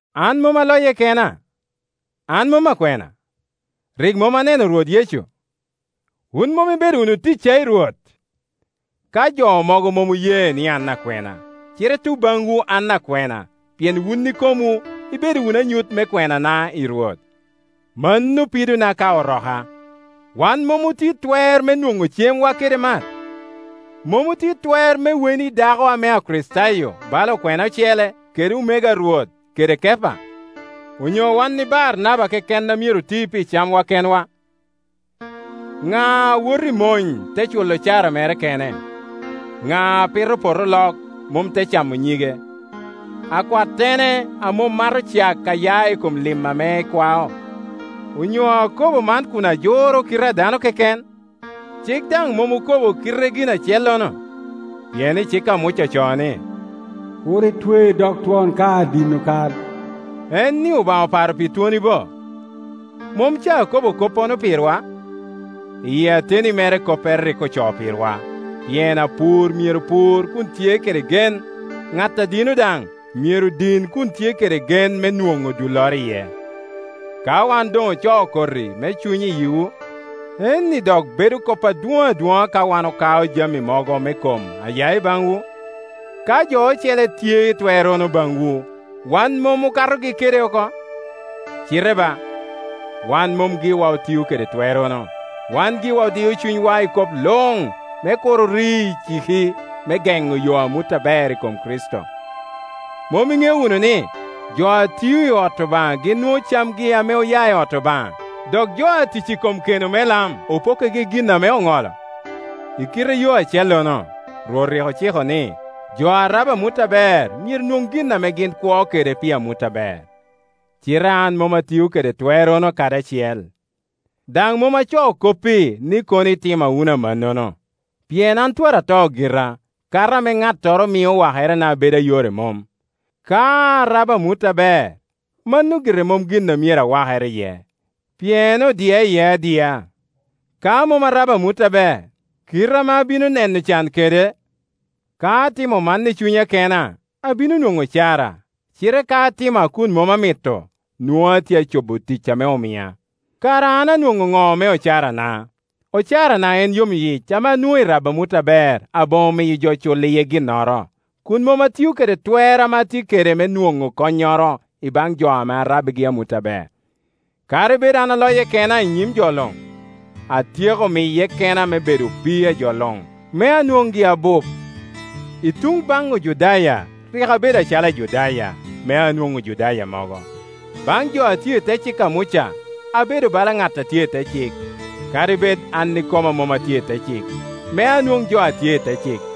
An mom aloye kena? An mom akwena? Rik mom aneno Rwot Yecu? Wun mom ibedo wunu ticca i Rwot? Ka jo mogo mom oye ni an akwena, cite i tuŋ baŋwu an akwena, pien wun ikomwu ibedo wunu anyut me kwenana i Rwot. Mano pidona ka oroka. Wan mom otye i twer me nwoŋo cemwa kede mat? Mom otye i twer me weno i dako ame Akricitayo, bala okwena ocele, kede omego a Rwot, kede Kepa? Onyo wan i Baranaba keken a myero oti pi camwa kenwa? Ŋa a woto i mony, te culo ocara mere kene? Ŋa a pito poto olok, mom te camo nyige? Akwattene a mom mato cak a ya i kom lim ame ekwao? Onyo akobo man kun ajuro kite a dano keken? Cik daŋ mom okobo kite gin acellono? Tem. 5.18Pien i cik a Muca ocoo ni, “Kur itwe dog twon ka adino kal.” En-ni Obaŋa oparo pi twoni bo? Mom ca akobo koppono pirwa? Iyi ateni mere koppere rik ocoo pirwa, pien apur myero pur kun tye kede gen, ŋat a dino daŋ myero din kun tye kede gen me nwoŋo dulloro iye. Ka wan doŋ ocoo koti me Cuny i yiwu, en-ni dok bedo kop adwoŋ adwoŋa ka wan okao jami mogo me kom a ya i baŋwu? Ka jo ocele tye i twerrono baŋwu, wan mom okatogi kede oko? Cite ba, wan mom giwa otio kede twerrono; wan giwa odio cunywa i kop luŋ me kur ori iciki me geŋo yo amut aber i kom Kricito. Mom iŋeo wunu ni, jo a tio i ot Obaŋa gin nwoŋo camgi ame oya i ot Obaŋa, dok jo a tic i kom keno me lam opokkigi gin ame oŋolo? I kite yo acellono, Rwot rik ociko ni, jo a rabo amut aber myero nwoŋ gin ame gin kwo kede pi amut aber. Cite an mom atio kede twerrono kadi acel. Daŋ mom acoo kop-pi ni kono itima wunu amannono. Pien an twara ata gira, kato ame ŋattoro mio wakerena bedo a yore mom. Ka arabo amut aber, mano gire mom gin a myero awakere iye, pien odia iye adia. Ka mom arabo amut aber, kite ame abino neno can kede! Ka atimo man i cunya kena, abino nwoŋo ocara, cite ka atimo a kun mom amito, nwoŋo a tye acobo tic ame omia. Kara an anwoŋo ŋo me ocarana? Ocarana en yomyic ame anwoŋo i rabo amut aber aboŋo miyo jo culo iye ginnoro, kun mom atio kede twer ame atye kede me nwoŋo konnyoro i baŋ jo ame arabbigi amut aber. Kadi bed an aloye kena i nyim jo luŋ, atyeko miye kena me bedo opii a jo luŋ, me anwoŋgi abup. I tuŋ baŋ Ojudaya rik abedo acalo Ajudaya, me anwoŋ Ojudaya mogo; baŋ jo a tye i te cik a Muca abedo bala ŋat a tye i te cik, kadi bed an ikoma mom atye i te cik, me anwoŋ jo a tye i te cik.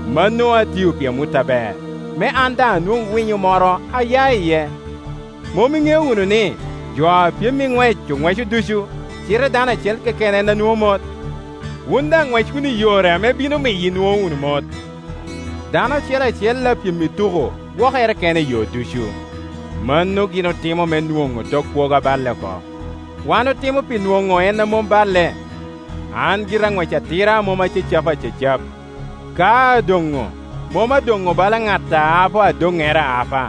Mano atio pi amut aber, me an daŋ anwoŋ winyo moro a ya iye. Mom iŋeo wunu ni, jo a pyem i ŋwec oŋweco ducu, cite dano acel keken en a nwoŋo mot? Wun daŋ ŋwec wunu i yore ame bino miyo inwoŋo wunu mot. Dano acel acel a pyem i tuko gwokere kene i yo ducu. Mano gin otimo me onwoŋ tok kwogo aballe oko, wan otimo pi nwoŋo en a mom balle. An gira aŋwec atira a mom acacapa acacap; ka adoŋo, mom adoŋo bala ŋat a apo adoŋŋere aapa.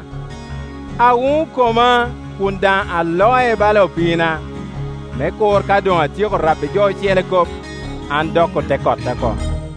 Awuŋo koma, kun daŋ aloe bala opiina, me kur ka doŋ atyeko rabbi jo ocele kop, an dok ote kota oko.